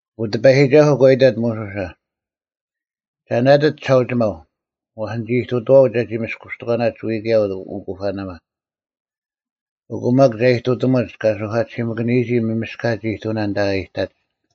ᐊᑯ ᑎᐸᔨᒋᒐᓱᐤ ᒂ ᐃᑕᑦ ᒧᓱᓴ, “ᒐ ᓇᑎᑦ ᒋᓴᐅᒋᒪᐤ, ᐛᔅ ᓂᒋ ᐃᑐᑐᐛᐅᒡ ᒐᒋ ᒥᔅᑯᔅᑎᒂᓇᒡ ᐎᔾ ᑭᔭ ᐅᑯᐸᓇᒪ, ᐊᑯ ᒪᒃ ᒐ ᐃᑐᑎᒧᒡ ᑲ ᓱᐧᑲᑎᓯᒥᑭᓂᔨᒋ ᒪᒥᔅᑲᒡ ᐃᑐᐅᓇ ᐊᓐᑕ ᐊ ᐃᑕᒡ᙮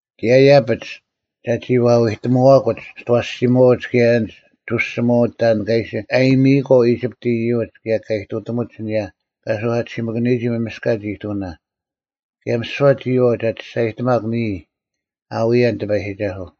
ᑭᔭ ᐃᔭᐱᒡ ᒐᒋ ᐛ ᐎᑎᒧᐛᑯᒡ ᒋᑦ ᐊᐛᓯᒧᐛᐅᒡ ᑭᔭ ᐊᓐᒡ ᒍᓯᒧᐛᐅᒡ ᑕᓐ ᑲ ᐃᓯ ᐊᔨᒥᔨᐊᒂᐤ ᐃᒋᑉᑦ ᐃᔪᒡ ᑭᔭ ᑲ ᐃᑐᑎᒧᒡ ᐊᓂᔭ ᑲ ᓱᐧᑲᑎᓯᒥᑭᓂᔨᒋ ᒪᒥᔅᑲᒡ ᐃᑐᐅᓇ, ᑭᔭ ᒥᓯᐛ ᒋᔨᐛᐤ ᒐ ᒋᔅᒐᔨᑎᒪᒄ ᓂᔾ ᐊ ᐎᔭᓐ ᑎᐸᔨᒋᒐᓱᐤ᙮”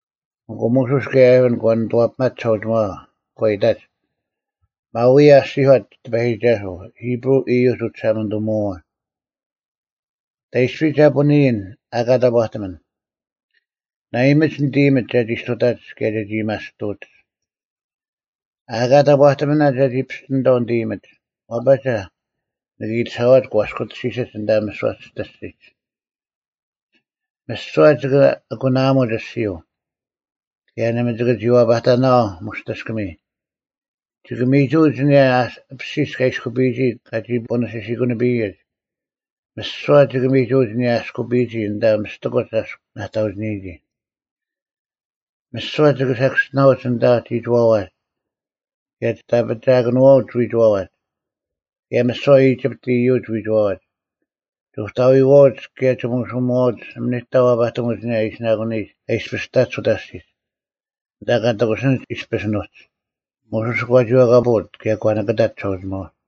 ᐊᑯ ᒧᓱᔅ ᑭᔭ ᐊᕋᓐ ᒂ ᓂᑐᐛᐱᒪᒡ ᒋᓴᐅᒋᒪᐛ᙮ ᒂ ᐃᑕᒡ, “ᒪᐤ ᐅᔭ ᐊᔅᒋᔄᑦ ᑎᐸᔨᒋᒐᓱᐤ, ᐃᑉᕈᐤ ᐃᔪᒡ ᐅᒋᓴᒪᓂᑐᒧᐛᐛ, ‘ᑕᐃᔅᐱ ᒐ ᐳᓂᔨᓐ ᐊᑲ ᑕᑈᑎᒥᓐ? ᓇᐃᒥᒡ ᓂᑦ ᐃᔨᒥᒡ ᒐᒋ ᔅᑐᑕᒡ ᑭᔭ ᒐᒋ ᐊᔭᒥᐊᔅᑐᐅᒡ᙮ ᐊᑲ ᑕᑈᑎᒥᓇ ᒐᒋ ᐱᔅᑎᓂᑥᐤ ᓂᑦ ᐃᔨᒥᒡ, ᐛᐸᒐ ᓂᑭ ᐃᑎᓴᐛᒡ ᒂᔅᑯᑎᓯᓯᒡ ᐊᓐᑕ ᒥᓯᐛ ᒋᑦ ᐊᔅᒋᐛᒡ᙮ ᒥᓯᐛ ᒋᑭ ᐊᑯᓇᐊᒧᒡ ᐊᔅᒋᔪᐤ, ᑭᔭ ᓇᒪ ᒋᑭ ᒋ ᐛᐸᑕᓇᐛᐤ ᒧᔅᑎᔅᑭᒥᔾ᙮ ᒋᑭ ᒥᒍᐅᒡ ᐊᓂᔭ ᐊᐱᓯᔅ ᑲ ᐃᔅᑯᐱᔨᒋ ᑲᒋ ᐳᓂ ᓯᓯᑯᓂᐱᔨᒡ᙮ ᒥᓯᐛ ᒋᑭ ᒥᒍᐅᒡ ᐊᓂᔭ ᐊᔅᑯᐱᔨᒋ ᐊᓐᑕ ᒥᔅᑎᑯᒡ ᐊᔅᒄ ᓇᑕᐅᒋᓂᔨᒋ᙮ ᒥᓯᐛ ᒋᑭ ᓴᑭᔅᒋᓇᐅᒡ ᐊᓐᑕ ᒋᒋᐛᐛᒡ ᑭᔭ ᒋᑦ ᐊᐱᒋᐊᑭᓄᐛᐅᒡ ᐎᒋᐛᐛᒡ, ᑭᔭ ᒥᓯᐛ ᐃᒋᑉᑎᒡ ᐃᔪᒡ ᐎᒋᐛᐛᒡ᙮ ᒍᑕᐎᐛᐅᒡ ᑭᔭ ᒋᒧᓱᒧᐛᐅᒡ ᓇᒪ ᓂᑕ ᐛᐸᑎᒧᒡ ᐊᓂᔭ ᐊᓯᓇᑯᓂᔨᒡ ᑲ ᐃᔅᐱᔅ ᑕᒡ ᐅᑕ ᐊᔅᒋᒡ, ᐊᓐᑕ ᑲ ᑎᑯᓯᓂᒡ ᐃᔅᐱᔅ ᐊᓄᒡ᙮’” ᒧᓱᔅ ᒂ ᒋᐛᑲᐳᐅᑦ ᑭᔭ ᒂ ᓂᑭᑕᑦ ᒋᓴᐅᒋᒪᐛ᙮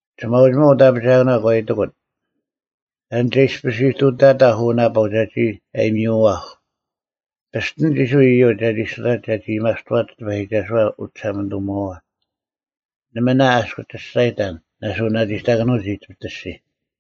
ᒋᓴᐅᒋᒪᐤ ᐅᑦ ᐊᐱᒋᐊᑭᓇ ᒂ ᐃᑎᑯᑦ, “ᑕᓐ ᒐ ᐃᔅᐱᔅ ᐃᑐᑕᑕᐧᒄ ᐅ ᓇᐸᐤ ᒐᒋ ᐊᔨᒥᐅᐛᐧᒃ? ᐱᔅᑎᓂᒡ ᐃᔅᕋᐃᓪ ᐃᔪᒡ ᒐᒋ ᔅᑐᑕᒡ ᒐᒋ ᐊᔭᒥᐊᔅᑐᐛᒡ ᑎᐸᔨᒋᒐᓱᐛ ᐅᒋᓴᒪᓂᑐᒧᐛᐛ᙮ ᓇᒪ ᐊ ᐊᔅᒄ ᒋᔅᒐᔨᑕᓐ ᓇᓱᓇᒋᑕᑭᓄᐅᒡ ᐃᒋᑉᑦ ᐊᔅᒋᔾ?”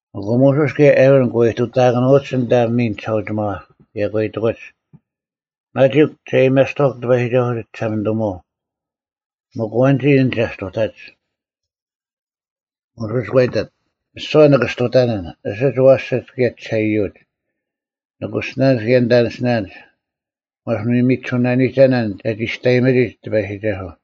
ᐊᑯ ᒧᓱᔅ ᑭᔭ ᐊᕋᓐ ᒂ ᐃᑐᑕᑭᓄᐅᒡ ᐊᓐᑕ ᒥᓐ ᒋᓴᐅᒋᒪᐛ, ᑭᔭ ᒂ ᐃᑎᑯᒡ, “ᒪᒋᒄ ᒐ ᐊᔭᒥᐊᔅᑐᐛᐧᒃ ᑎᐸᔨᒋᒐᓱᐤ ᒋᒋᓴᒪᓂᑐᒧᐛᐤ᙮ ᒥᒄ ᐊᐛᓐᒋ ᐊᓐ ᒐ ᔅᑐᑕᒡ?” ᒧᓱᔅ ᒂ ᐃᑕᑦ, “ᒥᓯᐛ ᓂᑭ ᔅᑐᑕᓇᓐ, ᐊᓯᒡ ᐊᐛᓯᐅᒡ ᑭᔭ ᐊ ᒋᓴᐃᔪᐅᒡ, ᓂᑯᓯᓇᓐᒡ ᑭᔭ ᓂᑕᓂᓯᓇᓐᒡ, ᑭᔭ ᒥᒋᑎᐧᑯᒡ᙮ ᐛᔅ ᓂᑭ ᐎ ᒥᒋᓱᓇᓂᒐᓇᓐ ᒐᒋ ᒋᔅᑕᔨᒥᒋᒡ ᑎᐸᔨᒋᒐᓱᐤ᙮”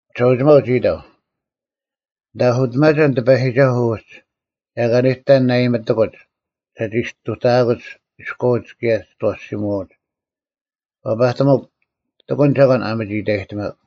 ᒋᓴᐅᒋᒪᐤ ᒋ ᐃᑕᐤ, “ᓂᑦ ᐊᓱᑎᒪᒐᓐ ᑎᐸᔨᒋᒐᓱᐤ ᐅᒡ, ᒐ ᐊᑲ ᓂᑕ ᓇᐊᔨᒥᑎᑯᒡ ᒐᒋ ᔅᑐᑕᐊᑯᒡ ᐃᔎᐅᒡ ᑭᔭ ᒋᑦ ᐊᐛᓯᒧᐛᐅᒡ! ᐛᐸᑎᒥᒄ, ᑎᑯᓐ ᒐᒂᓐ ᐊ ᒥᒋ ᐃᑕᔨᑎᒪᒄ᙮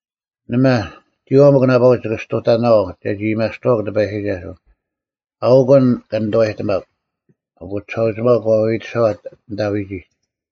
ᓇᒪ, ᒋᔨᐛᐤ ᒥᒄ ᓇᐸᐅᒡ ᒋᑭ ᔅᑐᑕᓇᐛᐤ ᒐᒋ ᐊᔭᒥᐊᔅᑐᐛᒄ ᑎᐸᔨᒋᒐᓱᐤ, ᐊᐅᒄ ᐊᓐ ᑲ ᓂᑐᐛᔨᑎᒪᒃ᙮” ᐊᑯ ᒋᓴᐅᒋᒪᐤ ᒂ ᐎᐎᑎᓴᐛᑦ ᐊᓐᑕ ᐎᒋᒡ᙮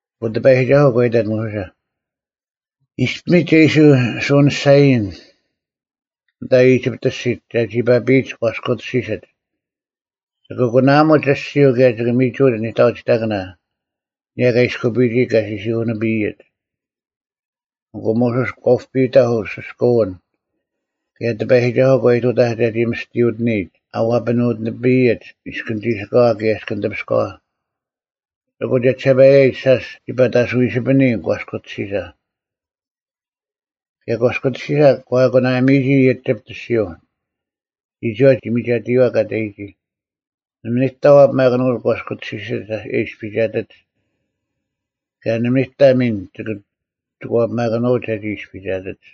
ᐊᑯ ᑎᐸᔨᒋᒐᓱᐤ ᒂ ᐃᑕᑦ ᒧᓱᓴ, “ᐃᔅᐱᒥᒡ ᒐ ᐃᓯ ᓱᐅᓂᔅᒐᐎᔨᓐ ᐊᓐᑕ ᐃᒋᑉᑦ ᐊᔅᒋᒡ ᒐᒋ ᐸᐱᔨᒡ ᒂᔅᑯᑎᓯᓯᒡ᙮ ᒋᑭ ᐊᑯᓇᐊᒧᒡ ᐊᔅᒋᔪᐤ ᑭᔭ ᒋᑭ ᒥᒍᐅᒡ ᓂᑕᐅᒋᑕᑭᓇ ᐊᓂᔭ ᑲ ᐃᔅᑯᐱᔨᒋ ᑲ ᓯᓯᑯᓂᐱᔨᒡ᙮” ᐊᑯ ᒧᓱᔅ ᒂ ᐅᐱᑕᐧᒃ ᐅᓯᔅᑲᐅᓐ, ᑭᔭ ᑎᐸᔨᒋᒐᓱᐤ ᒂ ᐃᑐᑕᐧᒃ ᒐᒋ ᒥᔅᑎᔪᑎᓂᔨᒡ ᐊ ᐛᐱᓄᑎᓂᐱᔨᒡ ᐃᔅᑭᓐ ᒋᓯᑲᐛ ᑭᔭ ᐃᔅᑭᓐ ᑕᐱᔅᑲᐛ᙮ ᐊᑯ ᒋᓴᒋᓴᐸᔭᔨᒡ, ᓴᔅ ᒋ ᐸᑕᓱᐎᓯᐱᓂ ᒂᔅᑯᑎᓯᓴ᙮ ᑭᔭ ᒂᔅᑯᑎᓯᓴ ᒂ ᐊᑯᓇᒥᔨᒋ ᐃᒋᑉᑦ ᐊᔅᒋᔪᐤ᙮ ᒋᒋᐛ ᒋ ᒥᒐᑎᔨᐛ ᑲ ᑕᔨᒋ᙮ ᓇᒪ ᓂᑕ ᐛᐱᒪᑭᓄᐅᒡ ᒂᔅᑯᑎᓯᓯᒡ ᐊ ᐃᔅᐱᒐᑎᒡ᙮ ᑭᔭ ᓇᒪ ᓂᑕ ᒥᓐ ᒋᑭ ᐛᐱᒪᑭᓄᐅᒡ ᒐᒋ ᐃᔅᐱᒐᑎᒡ᙮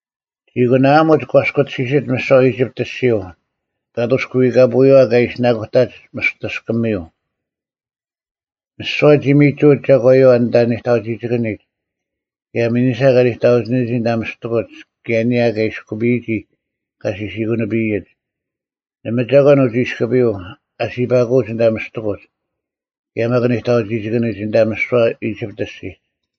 ᒋ ᐊᑯᓇᐊᒧᒡ ᒂᔅᑯᑎᓯᓯᒡ ᒥᓯᐛ ᐃᒋᑉᑦ ᐊᔅᒋᔪᐤ ᐸᑐᔅ ᑭ ᐎᐸᔪᐛ ᑲ ᐃᓯᓇᑯᑕᒡ ᒧᔅᑎᔅᑭᒥᔪᐤ᙮ ᒥᓯᐛ ᒋ ᒥᒍᐅᒡ ᒐᒂᔪᐛ ᐊᓐᑕ ᓂᑕᐅᒋᒋᑭᓂᒡ ᑭᔭ ᒥᓂᓴ ᑲ ᓂᑕᐅᒋᒋ ᐊᓐᑕ ᒥᔅᑎᑯᒡ ᑭᔭ ᐊᓂᔭ ᑲ ᐃᔅᑯᐱᔨᒋ ᑲ ᓯᓯᑯᓂᐱᔨᒡ᙮ ᓇᒪ ᒐᒂᓐ ᐅᒋ ᐃᔅᑯᐱᔪᐤ ᐊᓯᐸᑯᐅᒡ ᐊᓐᑕ ᒥᔅᑎᑯᒡ ᑭᔭ ᒪᒃ ᓂᑕᐅᒋᑕᑭᑭᓂᒡ ᐊᓐᑕ ᒥᓯᐛ ᐃᒋᑉᑦ ᐊᔅᒋᒡ᙮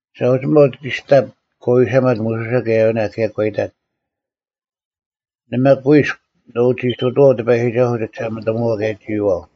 ᒋᓴᐅᒋᒪᐤ ᒋᔅᑎᑉ ᒂ ᐎᓴᒪᑦ ᒧᓱᓴ ᑭᔭ ᐊᕋᓇ ᑭᔭ ᒂ ᐃᑕᑦ, “ᓇᒪ ᑯᐃᔅᒄ ᓂ ᐅᒋ ᐃᑐᑐᐛᐤ ᑎᐸᔨᒋᒐᓱᐤ ᒋᒋᓴᒪᓂᑐᒧᐛᐤ ᑭᔭ ᒋᔨᐛᐤ᙮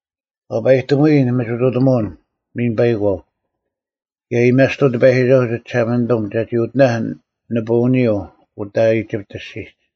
ᐛᐸᔨᑎᒧᐎᔾ ᓂᒥᒋᑐᑎᒧᐅᓐ ᒥᓐ ᐸᐃᒂᐤ, ᑭᔭ ᐊᔭᒥᐊᔅᑐᐤ ᑎᐸᔨᒋᒐᓱᐤ ᒋᒋᓴᒪᓂᑐᒻ ᒐᒋ ᐅᑎᓇᐧᒃ ᓂᐳᐅᓂᔪᐤ ᐅᑕ ᐃᒋᑉᑦ ᐊᔅᒋᒡ᙮”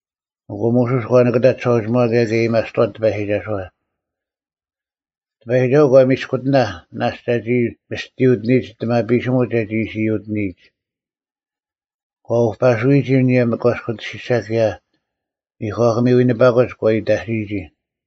ᐊᑯ ᒧᓱᔅ ᒂ ᓂᑭᑕᑦ ᒋᓴᐅᒋᒪᐛ ᑭᔭ ᒂ ᐊᔭᒥᐊᔅᑐᐛᑦ ᑎᐸᔨᒋᒐᓱᐛ᙮ ᑎᐸᔨᒋᒐᓱᐤ ᒂ ᒥᔅᑯᑎᓇᐧᒃ ᓇᔅᒡ ᒐᒋ ᒥᔅᑎᔪᑎᓂᔨᒡ ᐊᑎᒪᐱᓯᒧᒡ ᒐᒋ ᐃᓯ ᔪᑎᓂᔨᒡ᙮ ᒂ ᐅᐸᓯᔨᒋ ᐊᓂᔭ ᒂᔅᑯᑎᓯᓴ ᑭᔭ ᒥᒂᑭᒥ ᐎᓂᐸᑯᒡ ᒂ ᐃᑕᓯᔨᒋ᙮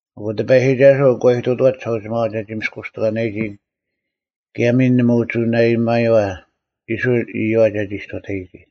ᐊᑯ ᑎᐸᔨᒋᒐᓱᐤ ᒂ ᐃᑐᑐᐛᑦ ᒋᓴᐅᒋᒪᐛ ᒐᒋ ᒥᔅᑯᔅᑎᒂᓇᔨᒋ ᑭᔭ ᒥᓐ ᓇᒪ ᐅᒋ ᓇᐊᔨᒪᔨᐛ ᐃᔅᕋᐃᓪ ᐃᔪᐛ ᒐᒋ ᔅᑐᑕᔨᒋ᙮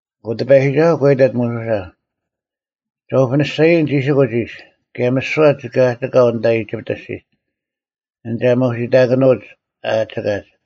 ᐊᑯ ᑎᐸᔨᒋᒐᓱᐤ ᒂ ᐃᑕᑦ ᒧᓱᓴ, “ᒐ ᐅᐱᓂᔅᒐᔨᓐ ᒋᓯᑯᒡ ᐃᔅ, ᑭᔭ ᒥᓯᐛ ᒋᑭ ᐊᒋᑲᐤ ᐊᓐᑕ ᐃᒋᑉᑦ ᐊᔅᒋᒡ, ᐊᓐ ᒐ ᒧᓯᑕᑭᓄᐅᒡ ᐊ ᐊᒋᑲᒡ᙮”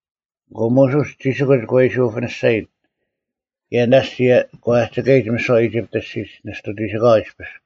ᐊᑯ ᒧᓱᔅ ᒋᓯᑯᒡ ᒂ ᐃᓯ ᐅᐱᓂᔅᒐᔨᑦ᙮ ᑭᔭ ᓇᔅᒡ ᒂ ᐊᒋᑲᔨᒡ ᒥᓯᐛ ᐃᒋᑉᑦ ᐊᔅᒋᒡ ᓂᔅᑐ ᒋᓯᑲᐛ ᐃᔅᐱᔅ᙮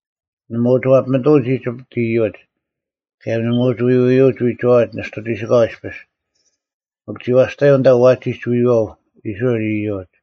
ᓇᒪ ᐅᒋ ᐛᐱᒥᑐᐅᒡ ᐃᒋᑉᑦ ᐃᔪᒡ, ᑭᔭ ᓇᒪ ᐅᒋ ᐎᐎᔪᐅᒡ ᐎᒋᐛᐛᒡ ᓂᔅᑐ ᒋᓯᑲᐛ ᐃᔅᐱᔅ᙮ ᒥᒄ ᒋ ᐛᔅᑕᔪᐤ ᐊᓐᑕ ᐛᒋᒡ ᐎᔨᐛᐤ ᐃᔅᕋᐃᓪ ᐃᔪᒡ᙮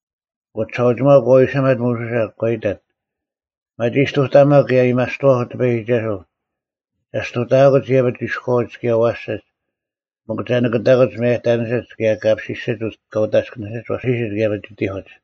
ᐊᑯ ᒋᓴᐅᒋᒪᐤ ᒂ ᐎᓴᒪᑦ ᒧᓱᓴ, ᒂ ᐃᑕᑦ, “ᒪᒋ ᔅᑐᑕᒪᒃ ᑭᔭ ᐊᔭᒥᐊᔅᑐᐛᐧᒃ ᑎᐸᔨᒋᒐᓱᐤ᙮ ᒐ ᔅᑐᑕᐊᑯᒡ ᐃᔭᐱᒡ ᐃᔎᐅᒡ ᑭᔭ ᐊᐛᓯᒡ ᒥᒄ ᒐ ᓂᑭᑕᑭᒡ ᒪᔭᑕᓂᓯᒡ ᑭᔭ ᑲ ᐱᓯᓯᒡ ᑲ ᐅᑕᔅᑭᓂᓯᒡ ᐊᐛᓯᓯᒡ ᑭᔭ ᒥᒋᑎᐧᑯᒡ᙮”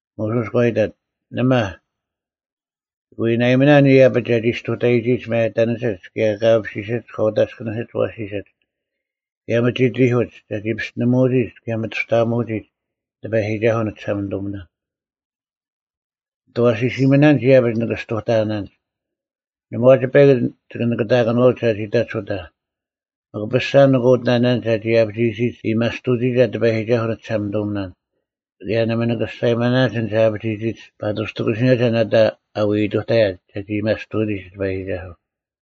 ᒧᓱᔅ ᒂ ᐃᑕᑦ, “ᓇᒪ, ᒋᑭ ᐎ ᓇᐃᒥᓇᓐ ᐃᔭᐱᒡ ᒐᒋ ᔅᑐᑕᔨᒋᒡ ᒪᔭᑕᓂᓯᒡ ᑭᔭ ᑲ ᐱᓯᓯᒡ ᑲ ᐅᑕᔅᑭᓂᓯᒡ ᐊᐛᓯᓯᒡ ᑭᔭ ᒥᒋᑎᐧᑯᒡ ᒐᒋ ᐱᔅᑎᓂᒧᐅᒋᒡ ᑭᔭ ᒥᑐᔅᑕᐊᒧᐅᒋᒡ ᑎᐸᔨᒋᒐᓱᐤ ᓂᒋᓴᒪᓂᑐᒥᓇᓐ᙮ ᓂᑦ ᐊᐛᓯᓯᒥᓇᒡ ᐃᔭᐱᒡ ᓂᑭ ᔅᑐᑕᐊᓇᓐᒡ᙮ ᓇᒪ ᐛᒡ ᐸᐃᒄ ᒋᑭ ᓂᑭᑕᑭᓄᐎᒡ ᒐᒋ ᑕᒡ ᐅᑕ᙮ ᒥᒄ ᐱᔅᒐ ᓂᑭ ᐅᑎᓇᓇᓐᒡ ᒐᒋ ᐊᐱᒋᔨᒋᒡ ᐊᔭᒥᐊᔅᑐᐅᒋᒐ ᑎᐸᔨᒋᒐᓱᐤ ᓂᒋᓴᒪᓂᑐᒥᓇᓐ᙮ ᑭᔭ ᓇᒪ ᓂᑭ ᒋᔅᒐᔨᒪᓇᓐᒡ ᐊᓐᒡ ᒐ ᐊᐱᒋᔨᒋᒡ ᐸᑐᔅ ᒋ ᑎᑯᓯᓂᔭᒐ ᓇᑕ ᐊ ᐎ ᐃᑐᑕᔭᒡ ᒐᒋ ᐊᔭᒥᐊᔅᑐᐅᒋᒡ ᑎᐸᔨᒋᒐᓱᐤ᙮”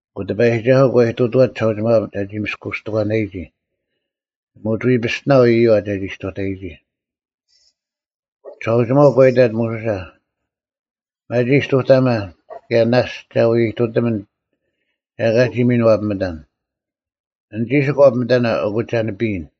ᐊᑯ ᑎᐸᔨᒋᒐᓱᐤ ᑲ ᐃᑐᑐᐛᑦ ᒋᓴᐅᒋᒪᐛ ᒐᒋ ᒥᔅᑯᔅᑎᒂᓇᔨᒋ᙮ ᓇᒪ ᐅᒋ ᐎ ᐱᔅᑎᓇᐤ ᐃᔪᐛ ᒐᒋ ᔅᑐᑕᔨᒋ᙮ ᒋᓴᐅᒋᒪᐤ ᒂ ᐃᑕᑦ ᒧᓱᓴ, “ᒪᒋ ᔅᑐᑕᒪ, ᑭᔭ ᓇᔅᒡ ᒐ ᐎ ᐃᑐᑎᒥᓐ ᒐ ᐊᑲ ᒋ ᒥᓐ ᐛᐱᒥᑕᓐ! ᐊᓐ ᒋᓯᒄ ᐛᐱᒥᑕᓇ, ᐊᑯ ᒐ ᓂᐱᔨᓐ᙮”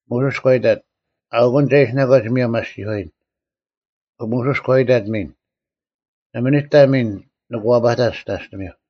ᒧᓱᔅ ᒂ ᐃᑕᑦ, “ᐊᐅᑯᓐ ᒐ ᐃᓯᓇᒂᒡ ᒧᔭᒻ ᐊᔅᒋᔄᔨᓐ,” ᒧᓱᔅ ᒂ ᐃᑕᑦ ᒥᓐ, “ᓇᒪ ᓂᑕ ᒥᓐ ᓂᑭ ᐛᐸᑕᓐ ᒋᑕᔅᑎᒥᐧᒄ᙮”